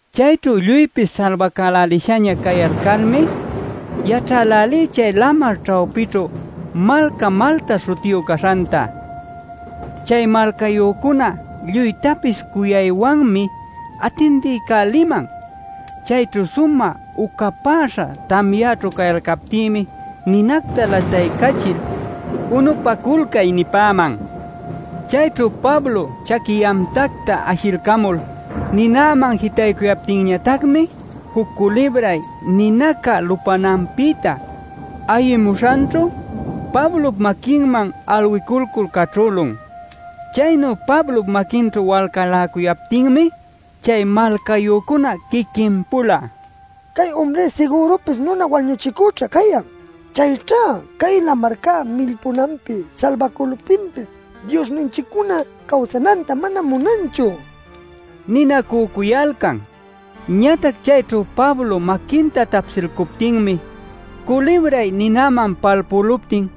Chayćhu lluypis salbacälälishaña cayalcalmi yaćhälälí chay lamar ćhawpićhu malca Malta śhutiyu caśhanta. Chay malcayücunaca lluytapis cuyaywanmi atindiycäliman. Chayćhu sumä ucapäśha tamyaćhu cayalcaptïmi ninacta lataycachil “Unupaculcay” nipäman. Chayćhu Pablo chaqui yamtacta ashilcamul ninäman jitaycuyaptinñatacmi juc culibray ninaca lupänanpïta ayimuśhanćhu Pablop maquinman alwicalcul caćhülun. Chaynu Pablop maquinćhu walcaläcuyaptinmi chay malcayücunaca quiquin-pula: “Cay umri sigürupis nuna wañuchicüćha cayan. Chayćhá cay lamarca millpunanpi salbacüluptinpis diosninchiccuná cawsananta mana munanchu” ninacücuyalcan. Ñatac chayćhu Pablo maquinta tapsïluptinmi culibray ninäman palpüluptin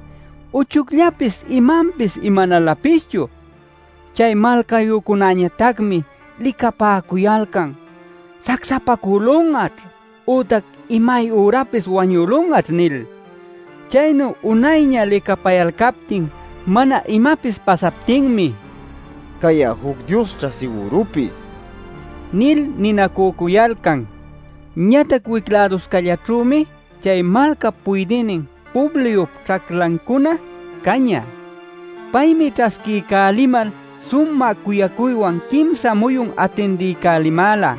uchuyllapis imanpis imanalapischu. Chay malcayücunañatacmi licapacuyalcan: “Sacsapacülun'aćh ütac imayürapis wañülun'aćh” nil. Chaynu unayña licapayalcaptin mana imapis pasaptinmi: “Cay'a juc diosćha sigürupis” nil ninacücuyalcan. Ñatac wic-läduscallaćhümi chay malcap puydïnin Publiop ćhaclancuna cañä. Paymi ćhasquiycälimal sumä cuyacuywan quimsa muyun atindiycälimäla.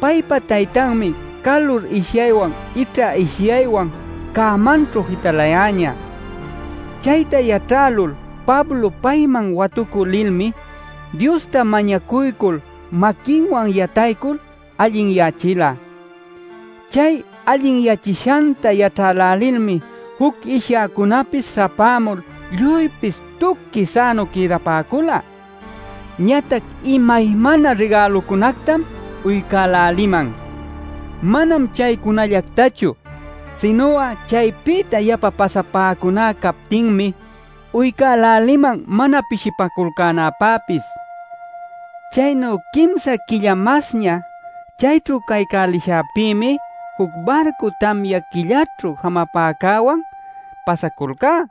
Paypa taytanmi calur ishyaywan ićha ishyaywan cämaćhu jitalayäñä. Chayta yaćhälul Pablo payman watucü lilmi Diosta mañacuycul maquinwan yataycul allinyächila. Chay allinyächishanta yaćhälälilmi juc ishyäcunäpis śhapämul lluypis tuqui sänu quïdapäcula. Ñatac imaymana rigälucunactam uycäläliman. Manam chaycunallactachu sinu'a chaypïta yapa pasapäcuná cayaptinmi uycäliman mana pishipaculcänäpäpis. Chaynu quimsa quilla masña chayćhu caycälishäpïmi juc barcu tamya quilläćhu jamapacücäwan pasaculcá.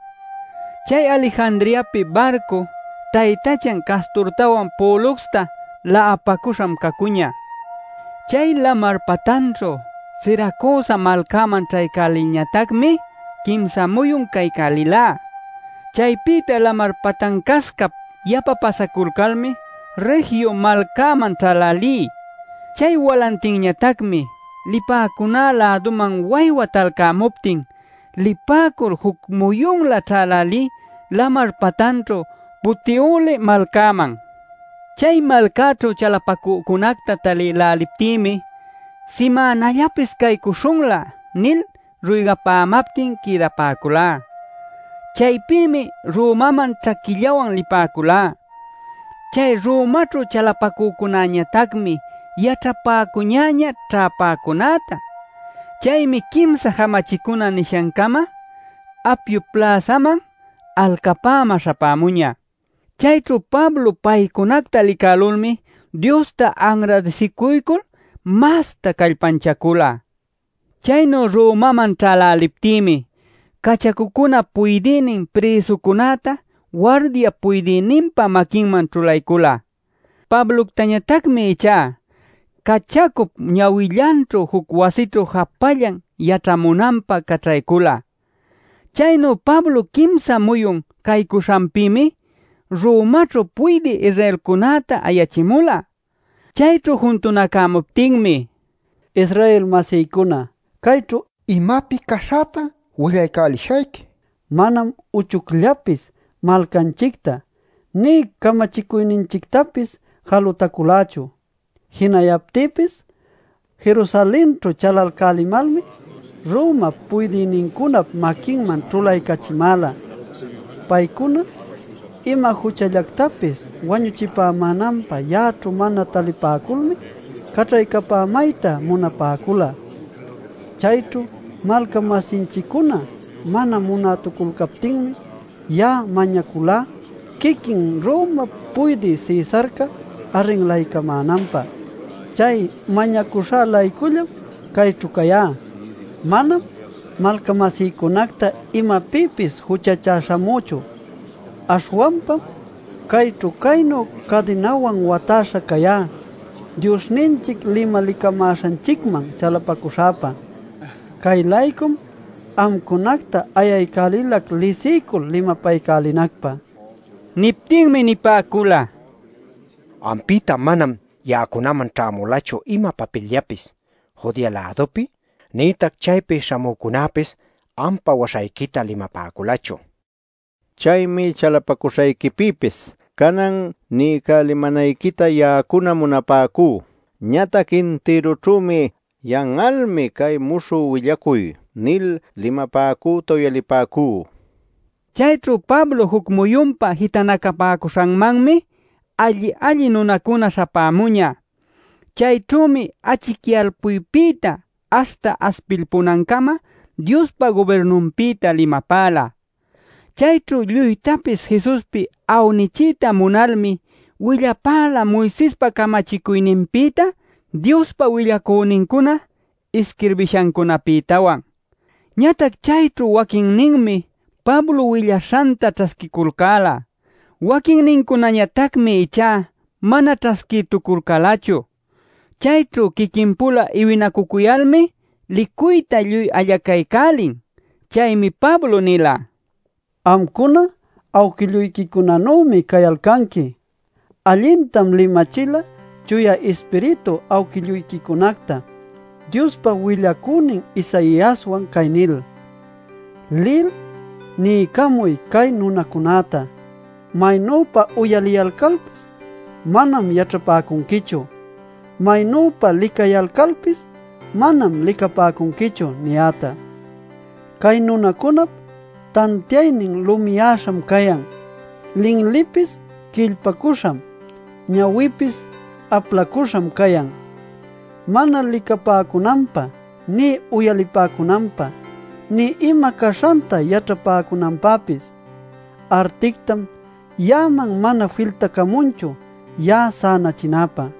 Chay Alejandriapi barcu taytachan Casturtawan Poluxta la'apacüśham cacuñä. Chay lamar patanćhu Siracusa malcaman ćhaycälilñatacmi quimsa muyun caycälilá. Chaypïta lamar patancascap yapa pasapäculmi Regio malcäman ćhälälí. Chay walantinñatacmi lipäcuná läduman waywa talcämuptin lipäcul juc muyunlä ćhälälí lamar patanćhu Puteoli malcäman. Chay malcaćhu chalapacücunacta talïläliptïmi “Simänallapis caycuśhunlä” nil ruygapämaptin quïdapäculá. Chaypïmi Romaman ćhaquillawan lipäculá. Chay Romaćhu chalapacücunañatacmi yaćhapäcuñä ćhäpäcunäta. Chaymi Quimsa Jamachicuna nishancama Apiop pläsaman alcapämä śhapämuñä. Chayćhu Pablo paycunacta licälulmi Diosta anradisicuycul masta callpanchacula. Chaynu Romaman ćhäläliptïmi ˻cachacucunap puydïnin prïsucunäta wardiap puydïninpa maquinman ćhulaycula. Pabloctañatacmi ichá˼ cachacup ñawillanćhu juc wasićhu japallan yaćhamunanpä caćhaycula. Chaynu Pablo quimsa muyun caycuśhanpïmi Romaćhu puydï Israelcunäta ayachimula. Chayćhu juntunacämuptinmi: “Israel-masïcuna, cayćhu imapi caśhäta willaycälishayqui. Manam uchucllapis malcanchicta nï camachicuyninchictapis jalutaculächu. Jinayaptïpis Jerusalenćhu chalalcälimalmi Romap puydïnincunap maquinman ćhulaycachimäla. Paycuna ima juchallactapis wañuchipämänanpä ya'aćhu mana talipäculmi caćhaycapämayta munapäcula. Chayćhu malca-masinchiccuna mana munätuculcaptinmi ya'a mañaculá quiquin Romap Puydï Cesarca arrinlaycamänanpä. Chay mañacuśha-laycullam cayćhu cayá. Manam malca-masïcunacta imapïpis juchachä śhamüchu. Aśhwanpam cayćhu caynu cadinawan watäśha cayá Diosninchic limalicamäśhanchicman chalapacuśhäpa. Cay-laycum amcunacta ayaycälilac lisiycul, limapaycälinacpä” nila. Niptinmi nipäcula: “Ampïta manam ya'acunaman ćhämulachu ima papilllapis Judea-lädupi nïtac chaypi śhamücunäpis ampa waśhayquita limapäculachu. Chaymi chalapacuśhayquipïpis canan niycälimänayquita ya'acuna munapäcú. Ñatac intirućhümi ‘Yan'almi cay muśhü willacuy’ nil limapäcüta uyalipäcú” nin. Chayćhu Pablo juc muyunpä jitanacapäcuśhanmanmi alli-alli nunacuna śhapämuñä. Chayćhümi achicyalcuypïta aśhta aspilpunancama Diospa gubirnunpïta limapäla. Chayćhu lluytapis Jesuspi awnichiyta munalmi willapäla Moisespa camachicuyninpïta, Diospa willacünincuna isquirbishancunäpïtawan. Ñatac chayćhu waquinninmi Pablo willaśhanta ćhasquiculcäla. Waquinnincunañatacmi ichá mana ćhasquïtuculcälachu. Chayćhu quiquin-pula iwinacucuyalmi licuyta lluy allacaycälin. Chaymi Pablo nila: “Amcuna awquilluyquicunanümi cayalcanqui. Allintam limachila Chuya Ispiritu awquilluyquicunacta Diospa willacünin Isaiaswan cay nil: ‘Lil niycamuy cay nunacunäta: “Maynüpa uyaliyalcalpis manam yaćhapäcunquichu, maynüpa licayalcalpis manam licapäcunquichu” niyäta. Cay nunacunap tantiaynin lumiyäśham cayan, linlipis quillpacüśham, ñawinpis aplacüśham cayan, mana licapäcunanpä nï uyalipäcunanpä, nï ima caśhanta yaćhalpapäcunanpäpis. Artictam ya'aman mana filtapämunchu ya'a sänachinäpä’ nila.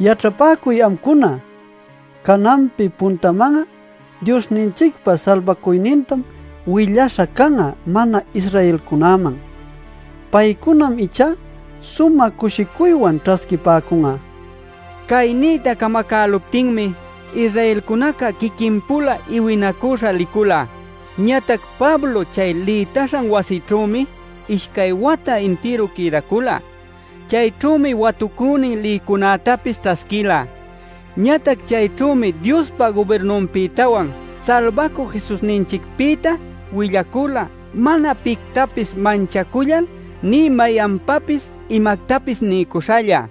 “¡Yaćhapäcuy amcuna! Cananpi puntaman'a Diosninchicpa salbacuynintam willaśha can'a mana-Israelcunäman. Paycunam ichá sumä cushicuywan ćhasquipäcun'a” nila. ˻Cay niyta camacäluptinmi Israelcunaca quiquin-pula iwinacüśha licula.˼ Ñatac Pablo chay lïtaśhan wasićhümi ishcay wata intiru quïdacula. Chayćhümi watucünin lïcunätapis ćhasquila. Ñatac chayćhümi Diospa gubirnunpïtawan Salbacü Jesusninchicpïta willacula mana pictapis manchacullal nï mayanpapis imactapis niycuśhalla.